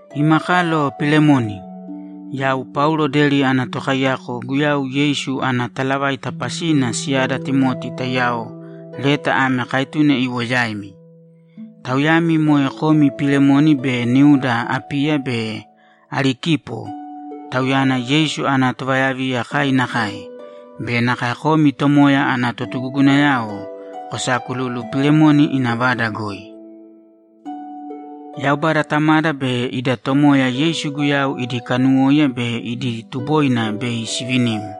Ima kalo Pilemoni, Yau Paulo deri ana tokaiyako Guyau Yeisu ana talavaita pasina siyada Timoti taiyao leta ame kaetune iwo yaimi; tauyami moe kom Pilemoni be niuda Apiya be Arikipo, tauyana Yeisu ana tovayaviya kai nakae, be nakae komi Tomoya ana totugugunayao kosaakululu Pilemoni ina vada goi. Yaubada Tamada be ida Tomoya Yeisu Guyau idi kanuwóiya be idi tuboina bei sivinim.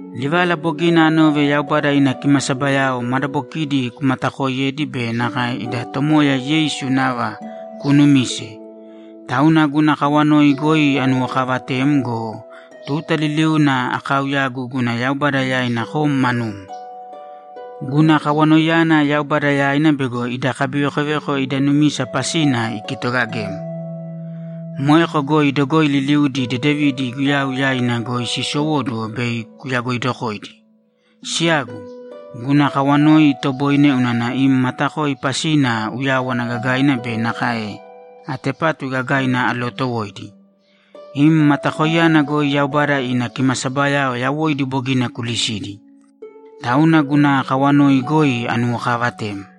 Livala bogina anove Yaubada ina kimasabayao madabokidi kumatakooiyedi be nakae ida Tomoya Yeisu nava kuunumise, tauna guna kawanoi goi anuwokaavatem go, tuta liliuna akaauyagu guna Yaubada yaina kom manum. Guna kawanoiyana Yaubada yaina bego ida kabivekoveko ida numisa pasina ikitogagem. Moeko goi dogoi liliudi dedevidi Guyau yaina goi siisowóduwo bei kuyagoidokoidi. Siyagu, guna kawanoi itoboine unana im matakoi pasina uyáwana gagaina be nakae atepatu gagaina alootowoidi. Im matakoiyana goi Yaubada ina kimasabayao yawoidi bogina kulisidi. Tauna guna kawanoi goi anuwokaavatem.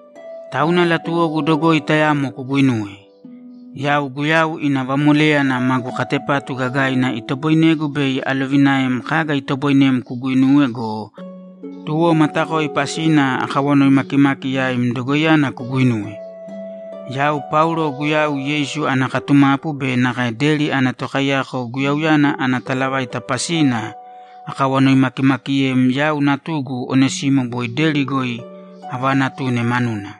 Tauna latuwogu dogoi tayamo kuguinuwe. Yau Guyau ina vamoléyana magu katepatu gagaina itoboinegu bei alovinaem kaga itoboinem kuguinuwe go, tuwo matakoi pasina akawanoi makimaki yaim dogoiyana kuguinuwe. Yau Paulo Guyau Yeisu ana katumapu be nakae deri ana tokaiyako Guyauyana ana talavaita pasina akawanoimakimakiyem yau natugu Onesimo boi deri goi avaanatune manuna.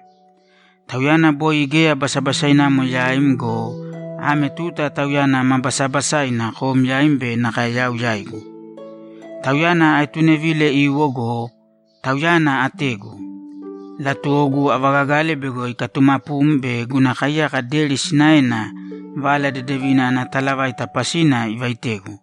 Tauyana boi geya basabasainamo yaim go, ame tuta tauyana ma basabasaina kom yaim be nakae yau yaigu. Tauyana aetunevile iwo go, tauyana ategu. Latuwogu avagagale bego ikatumapum be guna kaiyaka deri sinaena Vala Dedevina ana talavaita pasina ivaitegu.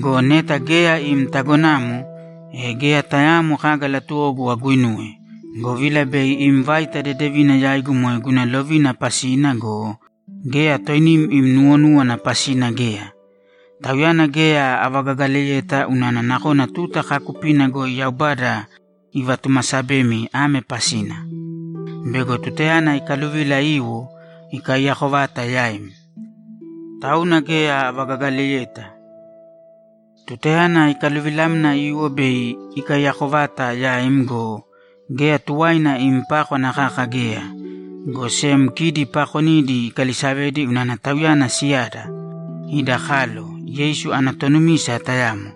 Go neta geya im tagonamo, e geya tayaamo kaga latuwogu aguinuwe, govila bei im vaita dedevina yaigu moe guna lovina pasina go, geya toinim im nuwonúwana pasina geya. Tauyana geya avagagaleyeta unana nakona tuta kaakupina goi Yaubada ivatumasabemi ame pasina: Bego tutayana ikaluvila iwo, ikaiyako vata yaim. Tauna geya avagagaleyeta. Tutayana ikaluvilamna iwo bei ikaiyako vata yaim go, geya tuwaina im pákwana kaka geya, go sem kidi paakonidi ikalisavedi unana tauyana siyada, ida kalo, Yeisu ana tonumisa tayamo.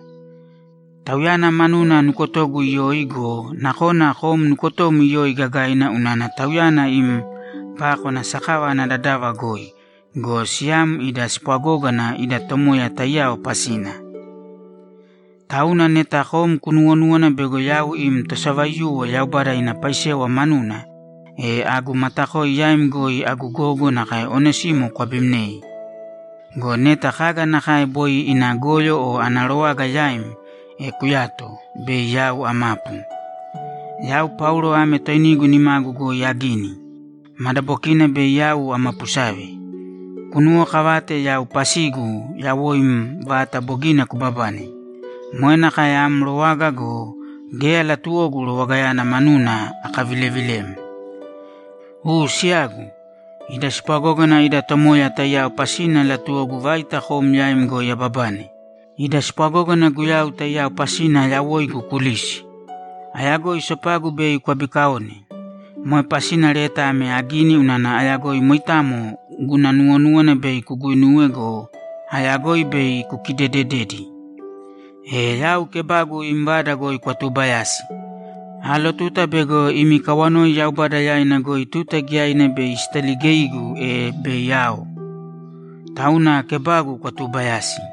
Tauyana manuna nukotogu iyoi go, nakona kom nukotom iyoi gagaina unana tauyana im pákwana sakava ana dadava goi go, siyam ida spwagógana ida Tomoya taiyao pasina! Tauna neta kom kunuwonúwana bego yau im tosavaiyuwo Yaubada ina paisewa manuna, e agu matakoi yaim goi agu gogo nakae Onesimo kwabimnēi. Go neta kaga nakae boi ina goyo o ana rowaga yaim, e kuyāto, bei yau amapu. Yau Paulo ame toinigu nimagu goi agini! Madabokina bei yau amapusave. Kunuwokavāte yau pasigu yawoim vata bogina kubabane. Moe nakae am rowaga go, geya latuwogu rowagayana manuna akavilevilem. U siyagu, ida spwagógana ida Tomoya taiyao pasina latuwogu vaita kom yaim goi ababane. Ida spwagógana Guyau taiyao pasina yawoigu kulīsi! Ayagoi sopagu bei kwabikaone. Moe pasina leta ame agini unana ayagoi moitamo guna nuwonúwana bei kuguinuwe go, ayagoi bei kukidedededi! E yau kebagu im vada goi kwatuubayāsi. Aalotuta bego imi kawanoi Yaubada yaina goi tuta giyaina bei sitaligeigu, e bei ao. Tauna kebagu kwatuubayāsi.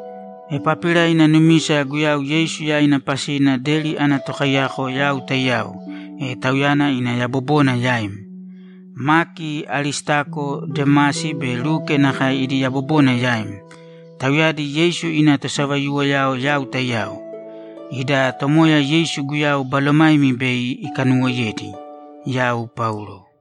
Epapira ina numisa Guyau Yeisu yaina pasina deri ana tokaiyako yau taiyao, e tauyana ina yabobona yaim. Maki, Aristako, Demasi be Luke nakae idi yabobona yaim; tauyadi Yeisu ina tosavaiyuwoyao yau taiyao. Ida Tomoya Yeisu Guyau balomaimi bei ikanuwoiyedi. Yau Paulo